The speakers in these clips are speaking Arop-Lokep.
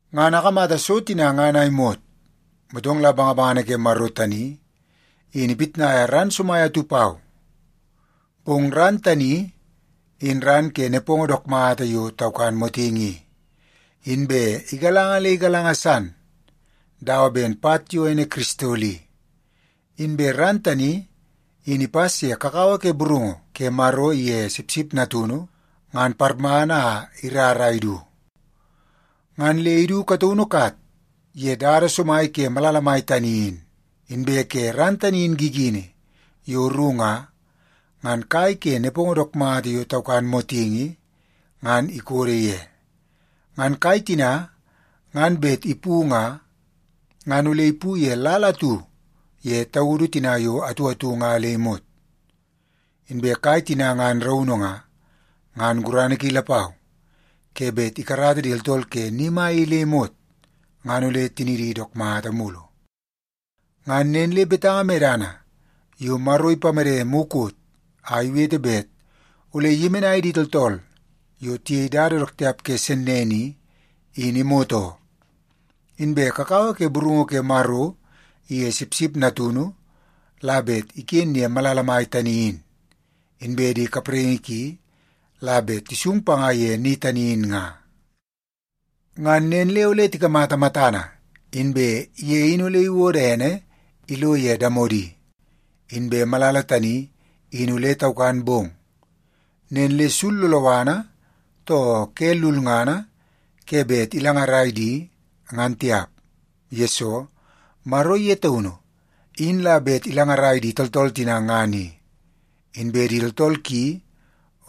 Ngan akamata so tina ngan a imot, motong la bangabangana ke Maro tani in ipitnaia ran somai atu pau. Bong ran tani in ran ke nepongo dook mata yo taukan motingi i, inbe igalanga le igalanga san dawa ben pat yo ene kiristol i. Inbe ran tani in ipas ye kakawa ke burungu ke Maro iye Sipsip Natunu ngan parmana a irar a idu. Ngan le idu kataunu kat ye dada somai ke malala mai tani in. Inbe ke ran tani in gigini yo ru nga, ngan kai ke nepongo dook mata yo taukan motingi ngan ikodo ye. Ngan kai tina ngan bet ipu nga, ngan ole ipu ye lal atu ye taudu tina yo atu atu nga le imot. Inbe kai tina ngan raunu nga, ngan gurana ki lapau ke bet ikarata di tooltool ke ni mai i le imot, ngan ole tinidi dook mata mulu. Ngan nen le betanga medana yo Maro ipamede mukot a iwete bet ole iyemenai di tooltool yo tiyei dada dook tiap ke sennene i, in imot oo. Inbe kakawa ke burungu ke Maro iye Sipsip Natunu la bet iken ye malala mai tani in, inbe di kapraingi ki la bet tisung panga ye ni tani in nga. Ngan nen le ole tikamata matana, inbe ye in ole iwodo ene ilo ye damodi. Inbe malala tani in ole taukan bong, nen le sul loloana too ke lulngana ke bet ilangarai di ngan tiap, yesoo Maro ye taunu in la bet ilangarai di tooltool tina ngan i. Inbe di tooltool ki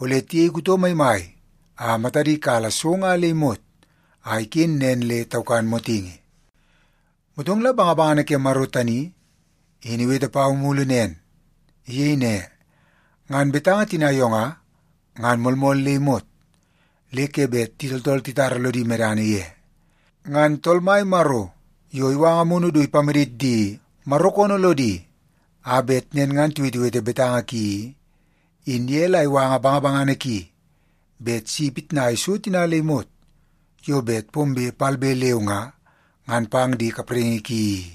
ole tiyei kuto maimai a matadi kala so nga le imot a iken nen le taukan motingi. Motong la bangabangana ke Maro tani in iwete pau mulu nen. Iyei ne, “Ngan betanga tina yo nga, ngan moolmool le imot le ke bet di tooltool titara lodi medana ye. Ngan Tool Mai Maro yo iwanga Amunu du ipamadit di Maro koonoo lodi a bet nen ngan tiwetewete betanga ki i, in ye la iwanga bangabangana ki bet si ipitnai so tina le imot yo bet pombe palbe leu nga, ngan pang di kapraingi ki i.”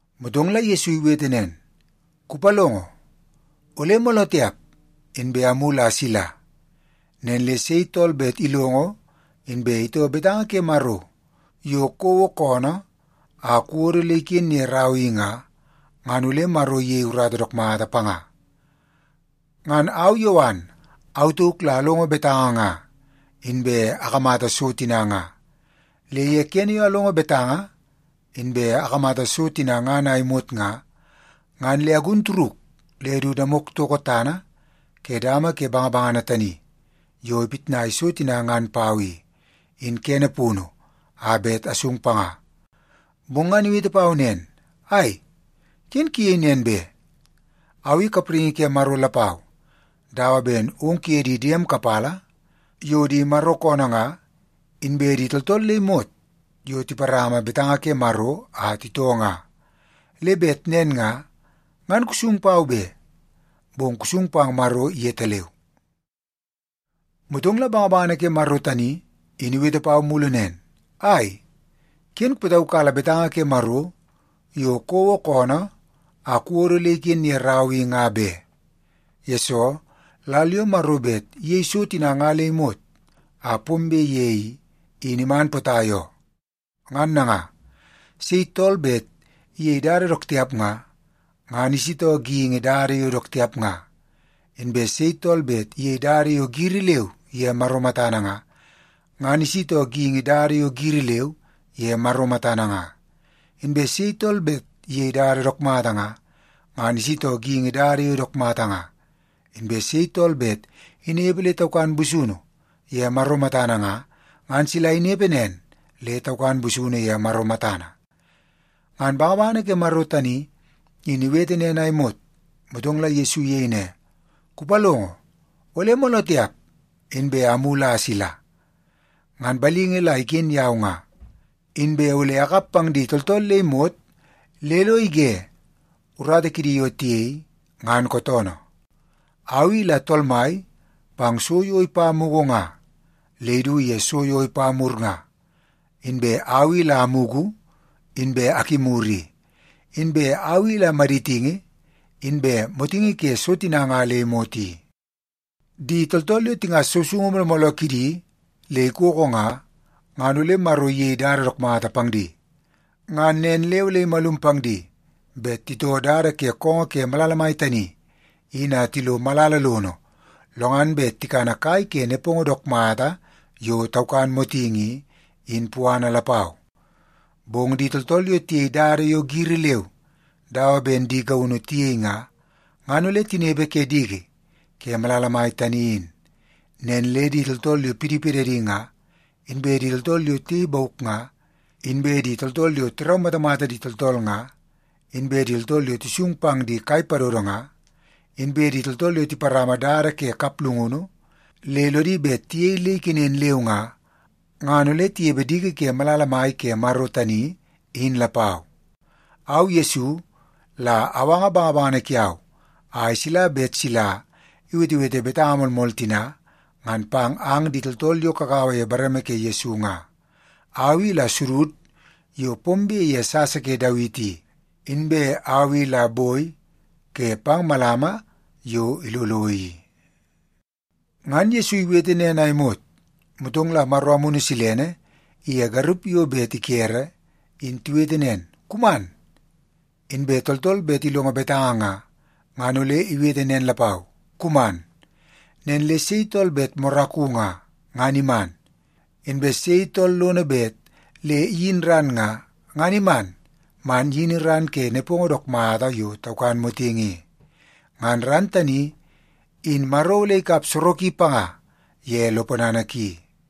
Motong la Yesu iwete nen, “Kupalongo, ole mooloo tiap inbe amulu a asila! Nen le sei tool bet ilongo inbe itoo betanga ke Maro yo kouo koonoo a kuwodo le iken ye rau i nga, ngan ole Maro iyei urata dook mata panga.” Ngan au Yowan, au tauk la alongo betanga nga, inbe akamata so tina nga. Le ye kene yo alongo betanga inbe akamata so tina ngan a imot nga, ngan le agun turuk le du damok toko tana ke dama ke bangabangana tani yo ipitnai so tina ngan pau i, in kene punu a bet asung panga. Bong ngan iwete pau nen, “Ai, ken kuyei nen be! Au i kapraingi ke Maro lapau dawa ben ong kuye di diem kapala yo di Maro koonoo nga, inbe di tooltool le imot yo tiparama betanga ke Maro a titoo nga. Le bet nen nga, ngan kusung pau be, bong kusung pang Maro yetaleu.” Motong la bangabangana ke Maro tani in iwete pau mulu nen, “Ai, ken kupataukala betanga ke Maro yo kouo koonoo a kuwodo le iken ye rau i nga be, yesoo lal yo Maro bet iyei so tina nga le imot a pombe ye i, in iman potai oo. Ngan nanga, sei tool bet iyei dada dook tiap nga, ngan isitoo geingi dada yo dook tiap nga. Inbe sei tool bet iyei dada yo giri leu ye Maro matana nga, ngan isitoo geingi dada yo giri leu ye Maro matana nga. Inbe sei tool bet iyei dada dook mata nga, ngan isitoo geingi dada yo dook mata nga. Inbe sei tool bet inepe le taukan busunu ye Maro matana nga, ngan sila inepe nen le taukan busunu ye Maro matana.” Ngan bangabangana ke Maro tani in iwete nen a imot, motong la Yesu iyei ne, “Kupalongo, ole mooloo tiap inbe amulu a asila! Ngan balingi la iken yau nga, inbe ole akap pang di tooltool le imot le lo ige urata kidi yo tiyei ngan kootoonoo. Au i la Tool Mai pang so yo ipa mugu nga le idu ye so yo ipa mur nga. Inbe au i la amugu, inbe akimur i. Inbe au i la maditingi, inbe motingi ke so tina nga le imot i. “Di tooltool yo tingas sousoungu mooloo mooloo kidi le ikoko nga, ngan ole Maro iyei dada dook mata pang di. Ngan nen le ole imalum pang di bet titoo dada ke koongoo ke malala mai tani in a tilo malala lono lo ngan bet tikana kai ke nepongo dook mata yo taukan motingi i, in puana lapau. Bong di tooltool yo tiyei dada yo giri leu dawa ben di gaunu tiyei nga, ngan ole tinepe ke diki ke malala mai tani in. Nen le di tooltool yo pidipidadi nga, inbe di tooltool yo tiyei bauk nga, inbe di tooltool yo tiraumatamata di tooltool nga, inbe di tooltool yo tisung pang di kai padodo nga, inbe di tooltool yo tiparama dada ke kaplungunu le lodi bet tiyei le ikenen leu nga, ngan ole tinepe diki ke malala mai ke Maro tani in lapau. “Au Yesu, la awanga bangabangana kiau a isila bet sila iwetewete betanga moolmool tina ngan pang ang di tooltool yo kagaua ye bareme ke Yesu nga. Au i la sudud yo pombe ye sasa ke Dawiti i, inbe au i la boi ke pang malama yo ilolo i.” Ngan Yesu iwete nen a imot, motong la Maro Amunu Silene iye garup yo bet ikere in tiwete nen, “Kuman!” Inbe tooltool bet ilongo betanga nga, ngan ole iwete nen lapau, “Kuman!” Nen le sei tool bet moraku nga, ngan iman. Inbe sei tool lono bet le iyin ran nga, ngan iman man iyini ran ke nepongo dook mata yo taukan motingi i. Ngan ran tani in Maro ole ikap soroki panga ye lo ponana ki.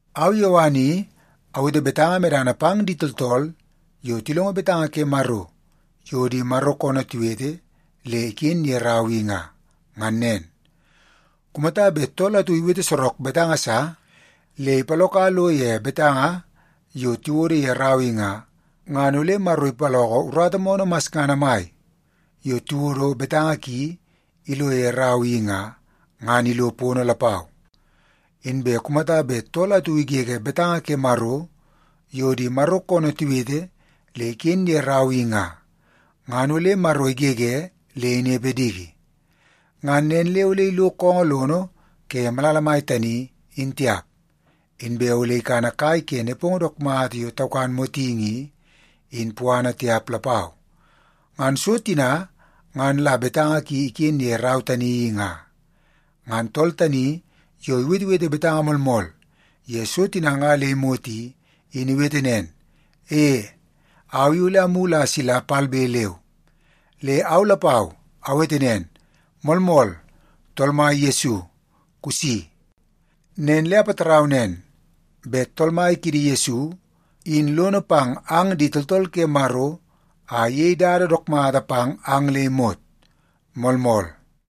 Au Yowan i awete betanga medana pang di tooltool yo tilongo betanga ke Maro yo di Maro koonoo tiwete le iken ye rau i nga, ngan nen. Kumata bet tool atu iwete sorok betanga sa le ipaloka lo ye betanga yo tiwodo ye rau i nga, ngan ole Maro ipaloko urata moonoo masngana mai yo tiwodo betanga ki ilo ye rau i nga, ngan ilo pono lapau. Inbe kumata bet tool atu igege betanga ke Maro yo di Maro koonoo tiwete le iken ye rau i nga, ngan ole Maro igege le inepe diki. Ngan nen le ole ilo koongoo lono ke malala mai tani, in tiap. Inbe ole ikana kai ke nepongo dook mata yo taukan motingi i, in puana tiap lapau. Ngan so tina ngan la betanga ki iken ye rau tani i nga. Ngan tool tani yo iwetewete betanga moolmool ye so tina nga le imot i, in iwete nen, “E, au i ole amulu a asila palbe leu.” Le au lapau awete nen, “Moolmool. Tool Mai Yesu, kusi.” Nen le apatarau nen bet Tool Mai kiidi Yesu in lono pang ang di tooltool ke Maro a iyei dada dook mata pang ang le imot. Moolmool.